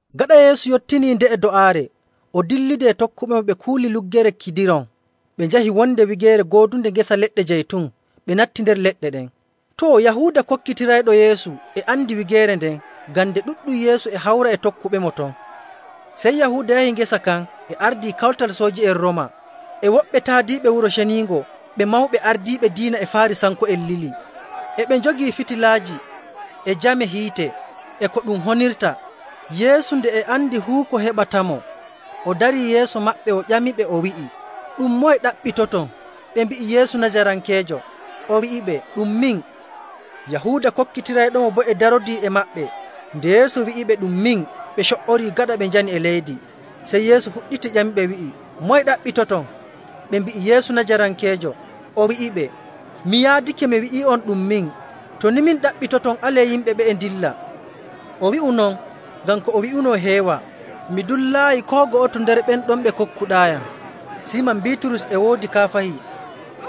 Gaɗa Yeesu yottinii nde'e do'aare, o dillidi e tokkuɓemo ɓe kuuli Luggere Kidiron. Ɓe njahi wonde wigeere goodunde ngesa leɗɗe jaytun, ɓe natti nder leɗɗe ɗen. Too, Yahuuda kokkitirayɗo Yeesu e andi wigeere nden, ngam nde ɗuɗɗum Yeesu e hawra e tokkuɓemo ton. Sey Yahuuda yahi ngesa kan e ardii kawtal sooji'en Rooma, e woɓɓe taadiiɓe Wuro Ceniingo ɓe mawɓe ardiiɓe diina e Faarisanko'en lili. E ɓe njogii fitilaaji, e jame hiite, e ko ɗum honirta. Yeesu nde e andi fuu ko heɓatamo, o darii yeeso maɓɓe o ƴamiɓe, o wi'i, “Ɗum moye ɗaɓɓitoton?” Ɓe mbi'i, “Yeesu Najarankeejo.” O wi'iɓe, “Ɗum min.” Yahuuda kokkitirayɗomo boo e darodii e maɓɓe. Nde Yeesu wi'iɓe, “Ɗum min,” ɓe co''orii gaɗa ɓe njani e leydi. Sey Yeesu fuɗɗiti ƴamiɓe wi'i, “Moye ɗaɓɓitoton?” Ɓe mbi'i, “Yeesu Najarankeejo.” O wi'iɓe, “Mi yaadake mi wi'ii'on ɗum min. To ni min ɗaɓɓitoton, alee yimɓe ɓe'e ndilla.” O wi'u non ngam ko o wi'uno heewa, “Mi dullaayi koo go'oto nder ɓen ɗon ɓe kokkuɗaayam.” Siiman Biiturus e woodi kaafahi,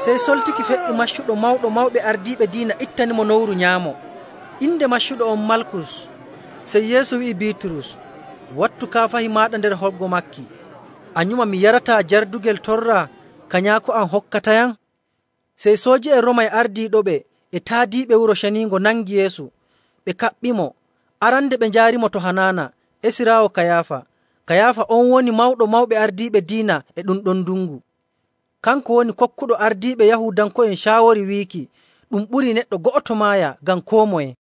sey soltiki fe''i maccuɗo Mawɗo Mawɓe Ardiiɓe Diina ittanimo nowru nyaamo. Inde maccuɗo on Malkus. Sey Yeesu wi'i Biiturus, “Wattu kaafahi maaɗa nder holgo maaki. A nyuma mi yarataa jardugel torra ka Nyaako am hokkatayam?”. Sey sooji'en Rooma e ardiiɗoɓe e taadiiɓe Wuro Ceniingo nangi Yeesu, ɓe kaɓɓimo. Arande ɓe njaarimo to Hanaana esiraawo Kayaafa. Kayaafa on woni Mawɗo Mawɓe Ardiiɓe Diina e ɗun ɗon ndungu. Kanko woni kokkuɗo ardiiɓe Yahuudanko'en caawori wiiki, ɗum ɓurii neɗɗo go'oto maaya ngam koo moye..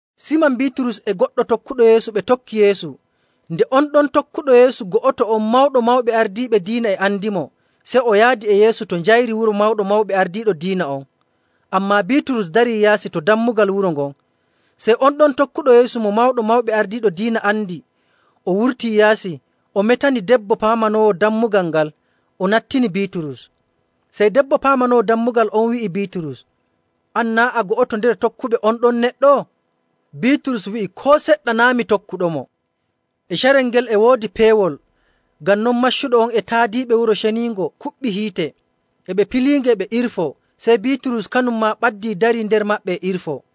Siiman Biiturus e goɗɗo tokkuɗo Yeesu ɓe tokki Yeesu. Nde on ɗon tokkuɗo Yeesu go'oto on Mawɗo Mawɓe Ardiiɓe Diina e andimo, sey o yaadi e Yeesu to njayri wuro Mawɗo Mawɓe Ardiiɓe Diina on. Ammaa Biiturus darii yaasi to dammugal wuro ngon. Sey on ɗon tokkuɗo Yeesu mo Mawɗo Mawɓe Ardiiɓe Diina andi, o wurtii yaasi, o metani debbo paamanoowo dammugal ngal, o nattini Biiturus. Sey debbo paamanoowo dammugal on wi'i Biiturus, “An, naa' a go'oto nder tokkuɓe on ɗon neɗɗo?” Biiturus wi'i, “Koo seɗɗa, naa' mi tokkuɗomo.” E carel ngel e woodi peewol, ngam non maccuɓe e taadiiɓe Wuro Ceniingo kuɓɓi hiite, e ɓe piliinge, e ɓe irfoo. Sey Biiturus kanum maa ɓaddii darii nder maɓɓe e irfoo.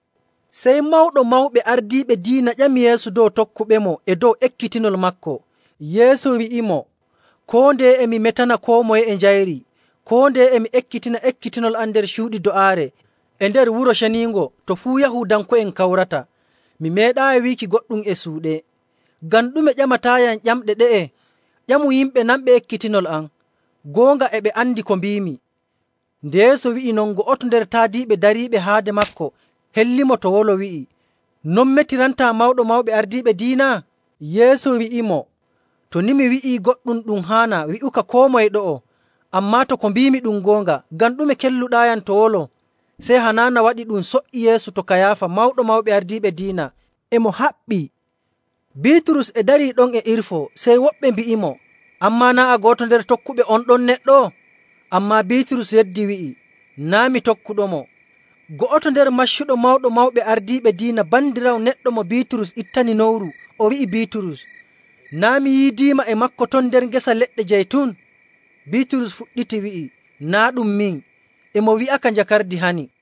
Sey Mawɗo Mawɓe Ardiiɓe Diina ƴami Yeesu dow tokkuɓemo e dow ekkitinol maako. Yeesu wi'imo, “Koo ndeye e mi metana koo moye e njayri. Koo ndeye e mi ekkitina ekkitinol am nder cuuɗi do'aare e nder Wuro Ceniingo to fuu Yahuudanko'en kawrata. Mi meeɗaayi wiiki goɗɗum e suuɗe. Ngam ɗume ƴamataayam ƴamɗe ɗe'e? Ƴamu yimɓe nanɓe ekkitinol am. Goonga e ɓe andi ko mbiimi.” Nde Yeesu wi'i non, go'oto nder taadiiɓe dariiɗo haade maako hellimo to wolo, wi'i, “Non metirantaa Mawɗo Mawɓe Ardiiɓe Diina?” Yeesu wi'imo, “To ni mi wi'ii goɗɗum ɗum haanaa, wi'uka koo moye ɗo'o. Ammaa to ko mbiimi ɗum goonga, ngam ɗume kelluɗaayam to wolo?” Sey Hanaana waɗi ɗum so''i Yeesu to Kayaafa Mawɗo Mawɓe Ardiiɓe Diina, e mo haɓɓii. Biiturus e darii ɗon e irfoo, sey woɓɓe mbi'imo, “An maa, naa' a go'oto nder tokkuɓe on ɗon neɗɗo?” Ammaa Biiturus yeddi wi'i, “Naa' mi tokkuɗomo.” Go'oto nder maccuɓe Mawɗo Mawɓe Ardiiɓe Diina bandiraawo neɗɗo mo Biiturus ittani nowru o wi'i Biiturus, “Naa' mi yiidiima e maako ton nder ngesa leɗɗe jaytun?” Biiturus fuɗɗiti wi'i, “Naa' ɗum min.” E mo wi'aka njakardi hani.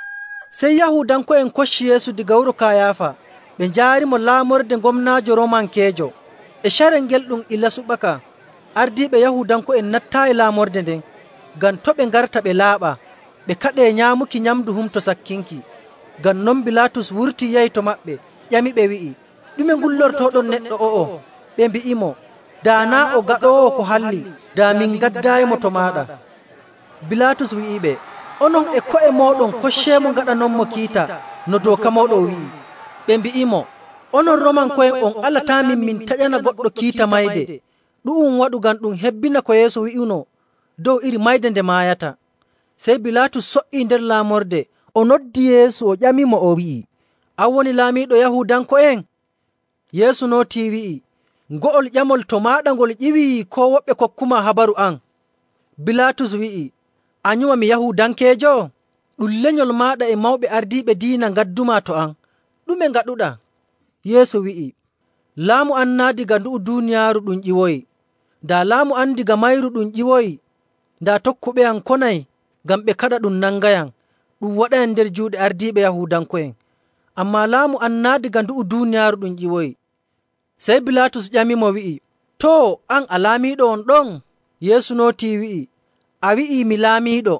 Sey Yahuudanko'en kocci Yeesu daga wuro Kayaafa ɓe njaarimo laamorde gomnaajo Roomankeejo. E carel ngel ɗum ilaa subaka. Ardiiɓe Yahuudanko'en nattaayi laamorde nden, ngam to' ɓe ngarta ɓe laaɓaa, ɓe kaɗee nyaamuki nyamndu Humto Sakkinki. Ngam non, Bilaatus wurtii yahi to maɓɓe ƴamiɓe, wi'i, “Ɗume ngullortooɗon neɗɗo o'o?” Ɓe mbi'imo, “Daa naa' o gaɗoowo ko halli, daa min ngaddaayimo to maaɗa.” Bilaatus wi'iɓe, “Onon e ko'e mooɗon kocceemo ngaɗanonmo kiita no dooka mooɗon wi'i.” Ɓe mbi'imo, “Onon Roomanko'en on alataamin min taƴana goɗɗo kiita mayde.” Ɗu'um waɗu ngam ɗum hebbina ko Yeesu wi'uno dow iri mayde nde maayata.. Sey Bilaatus so''ii nder laamorde, o noddi Yeesu, o ƴamimo o wi'i, “An woni laamiiɗo Yahuudanko'en?” Yeesu nootii, wi'i, “Ngo'ol ƴamol to maaɗa ngol ƴiwi, koo woɓɓe kokkumaa habaru am?” Bilaatus wi'i, “A nyuma mi Yahuudankeejo? Ɗum lenyol maaɗa e mawɓe ardiiɓe diina ngaddumaa to am. Ɗume ngaɗuɗaa?” Yeesu wi'i, “Laamu am naa' daga ndu'u duuniyaaru ɗum ƴiwoyi. Daa laamu am daga mayru ɗum ƴiwoyi, daa tokkuɓeyam konay ngam ɓe kaɗa ɗum nangayam ɗum waɗayam nder juuɗe ardiiɓe Yahuudanko'en. Ammaa laamu am naa' daga ndu'u duuniyaaru ɗum ƴiwoyi.” Sey Bilaatus ƴamimo wi'i, “Too, an, a laamiiɗo won ɗon?” Yeesu nootii, wi'i, “A wi'ii mi laamiiɗo.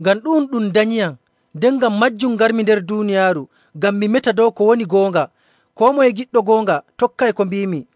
Ngam ɗu'um ɗum danyiyam, nden ngam maajum ngarmi nder duuniyaaru ngam mi meta dow ko woni goonga. Koo moye giɗɗo goonga tokkay ko mbiimi.”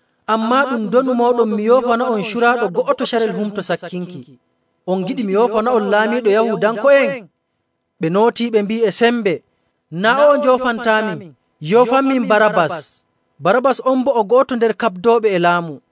Ammaa ɗum ndonu mooɗon mi yoofana'on curaaɗo go'oto carel Humto Sakkinki. On ngiɗi mi yoofana'on Laamiiɗo Yahuudanko'en?” Ɓe nootii ɓe mbi'i e sembe, “Naa' o'o njoofantaamin, yoofanmin Barabbas!” Barabbas on boo o go'oto nder kaɓdooɓe e laamu.